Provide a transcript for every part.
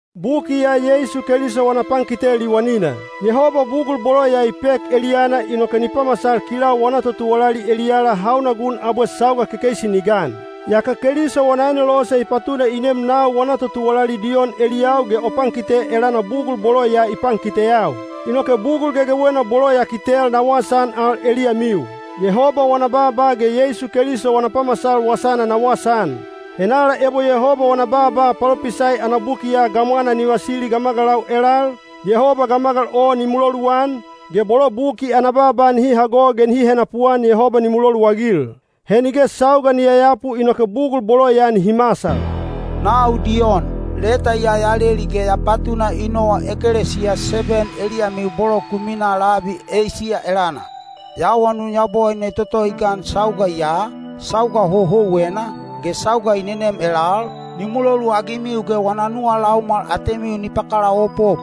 Buki ya Yeisu Keliso wana pankite liwanina. Yehoba bugul bolo ya i pek eliyana inoke ni pamasal kilau wana totuwalali eliyala hauna gun abwe sauga kekeisi ni gan. Yaka Keliso wana anelose i patuna i nem nau wana totuwalali Diyon eliyau ge o pankite elana bugul bolo ya i pankiteyau. Inoke bugul gegewena bolo ya kitel na wasaan al eliyamiu. Yehoba wana baaba ge Yeisu Keliso wana pamasal wasana na wasaan. Henala ebo Yehoba wana baaba palopisai ana buki ya gamwanaa ni vasili gamagalau elal, Yehoba gamagal o ni muloluan, ge bolo buki ana baaba nihi hago ge nihi henapuan Yehoba ni muloluagil. He nige sauga ni yayapu inoke bugul bolo ya nihi masal. Nau Diyon, leta ya ya leli ge ya patuna i nowa ekelesiya seben eliyamiu bolo ku minaa labi Eisiya elana. Ya awanun Yabowaine toto i gan sauga ya, sauga houhouwena, ge sauga i nenem elal, ni muloluagimiu ge wana nuwa laumwal atemiu ni pakalaopop.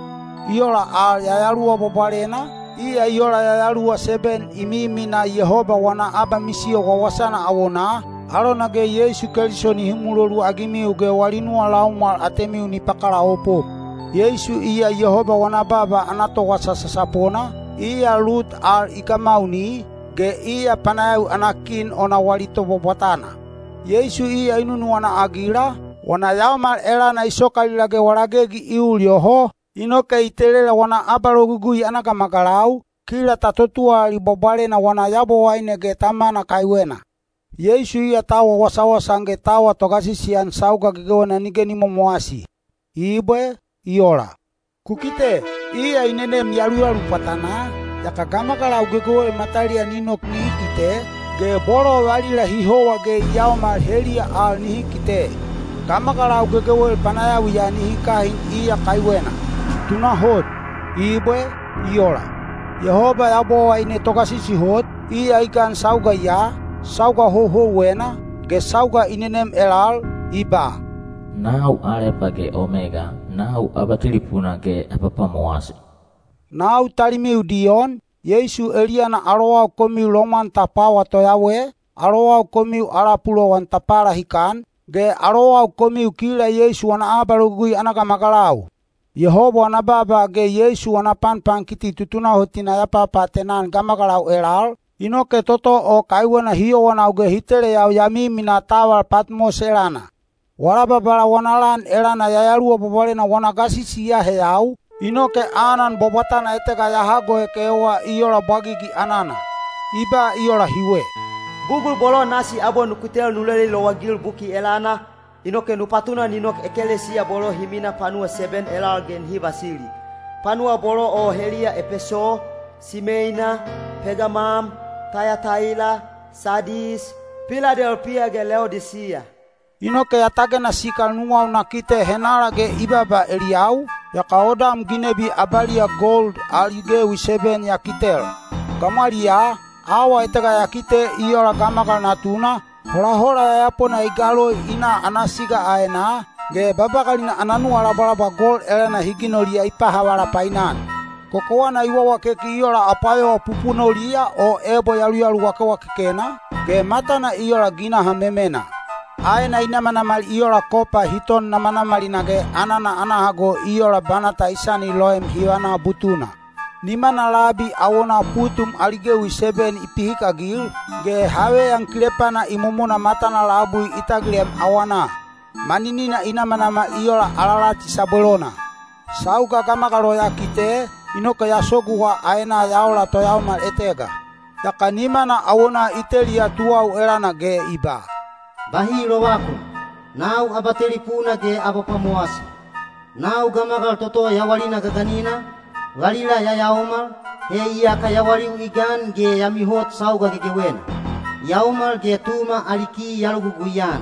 I ola al Yayaluwa Bwabwalena, iya i ola yayaluwa seben i miminaa Yehoba wana abamisiyo wawasana awonaa, alona ge Yeisu Keliso nihi muloluagimiu ge wali nuwa laumwal atemiu ni pakalaopop. Yeisu iya Yehoba wana baaba ana towasa sasapona, iya lut al i gamauni, ge iya panayawi ana kin ona wali tobwabwatana. Yeisu iya i nunuwana-agila, wana yaomal elana i sokalila ge wala gegi i ul yoho, inoke i telela wana abalogugui ana gamagalau, kila ta totuwalali bwabwalena wana Yabowaine ge Tamana kaiwena. Yeisu iya ta awa wasawasa-an ge ta awa togasisi-an sauga gegewena nige ni momowasi. Ibwe. I ola. Ku kite! Iya i nenem yaluyalu pwatanaa, yaka gamagalau gegewel mataliya ni nok nihi kite, ge bolo valila hi howa ge i yaomal heliya al nihi kite. Gamagalau gegewel panayawiya nihi kahin iya kaiwena. Tunahot! Ibwe. I ola. Yehoba Yabowaine Togasisi Hot, iya i gan sauga ya, sauga houhouwena, ge sauga i nenem elal, i ba, “Nau Alepa ge Omega, nau Abatelipuna ge Abapwamowasi.” Nau talimiu Diyon, Yeisu eliyana alowau komiu lomwan ta pwawa toyawe, alowau komiu ala pulowan ta palahikan, ge alowau komiu kila Yeisu wana abalogugui ana gamagalau. Yehoba wana baaba ge Yeisu wana panpankiti tutunahotina ya papaatena-an gamagalau elal, inoke toto o kaiwena hi yowanau ge hi teleyau ya miminaa taval Patmos elana. Wala Babala wana lan elana Yayaluwa Bwabwalena wana gasisi i aheyau, inoke anan bwabwatana etega ya hagoek ewa i ola bwagigi anana. I ba i ola hiwe, “Bugul bolo nasi abwe nu kitel nu leli lowagil buki elana, inoke nu patuna ni nok ekelesiya bolo hi minaa panuwa seben elal ge nihi vasili. Panuwa bolo o heliya Epeso, Simeina, Pegamam, Tayataila, Sadis, Piladelpiya ge Leodisiya.” Inoke ya tagena sikal nuwau na kite henala ge i baaba eliyau, yaka odam ginebi abaliya gold ali gewi seben ya kitel. Gamwaliyaa, awa etega ya kite “i ola gamagal natuna,” holahola yayapona i galoi i na ana siga aenaa, ge babagalina ana nuwalabwalabwa gold elana hi ginoliya i pahavala painan. Kokowana i wawakeki i ola apwayowa pupunoliya o ebo yaluyalu wakewakekena, ge matana i ola ginaha memena. Aena i namanamal i ola kopa hi ton namanamalina ge anana ana hago i ola banata i sani loem hivana butuna. Nimana labi awonaa putum ali gewi seben i pihikagil, ge haveyan kilepana imomona matana labui i tagilem awanaa. Maninina i namanamal i ola alalati sabwelona. Sauga gamagal o ya kite, inoke ya soguwa aenaa ya ola toyaomal etega. Yaka nimana awona i teliya tuwau elana ge i ba, “Bahi lovakun! Nau Abatelipuna ge Abapwamowasi. Nau Gamagal toto Yawalina Gaganina, valila ya yaomal, he iyaka yawaliu i gan ge ya mihot sauga gegewena. Yaomal ge Tuma ali ki ya logugui-an.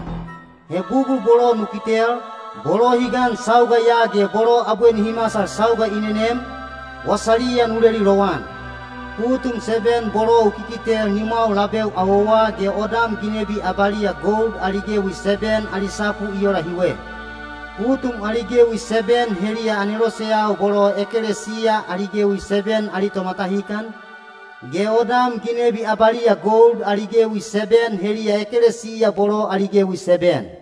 He bugul bolo nu kitel, bolo hi gan sauga ya ge bolo abwe nihi masal sauga i nenem, wasaliya nu leli lowan. Putum seben bolo u kikitel nimwau labeu awowa ge odam ginebi abaliya gold ali gewi seben ali sapu i ola hiwe: putum ali gewi seben heliya aneloseyau bolo ekelesiya ali gewi seben ali tomatahikan, ge odam ginebi abaliya gold ali gewi seben heliya ekelesiya bolo ali gewi seben.”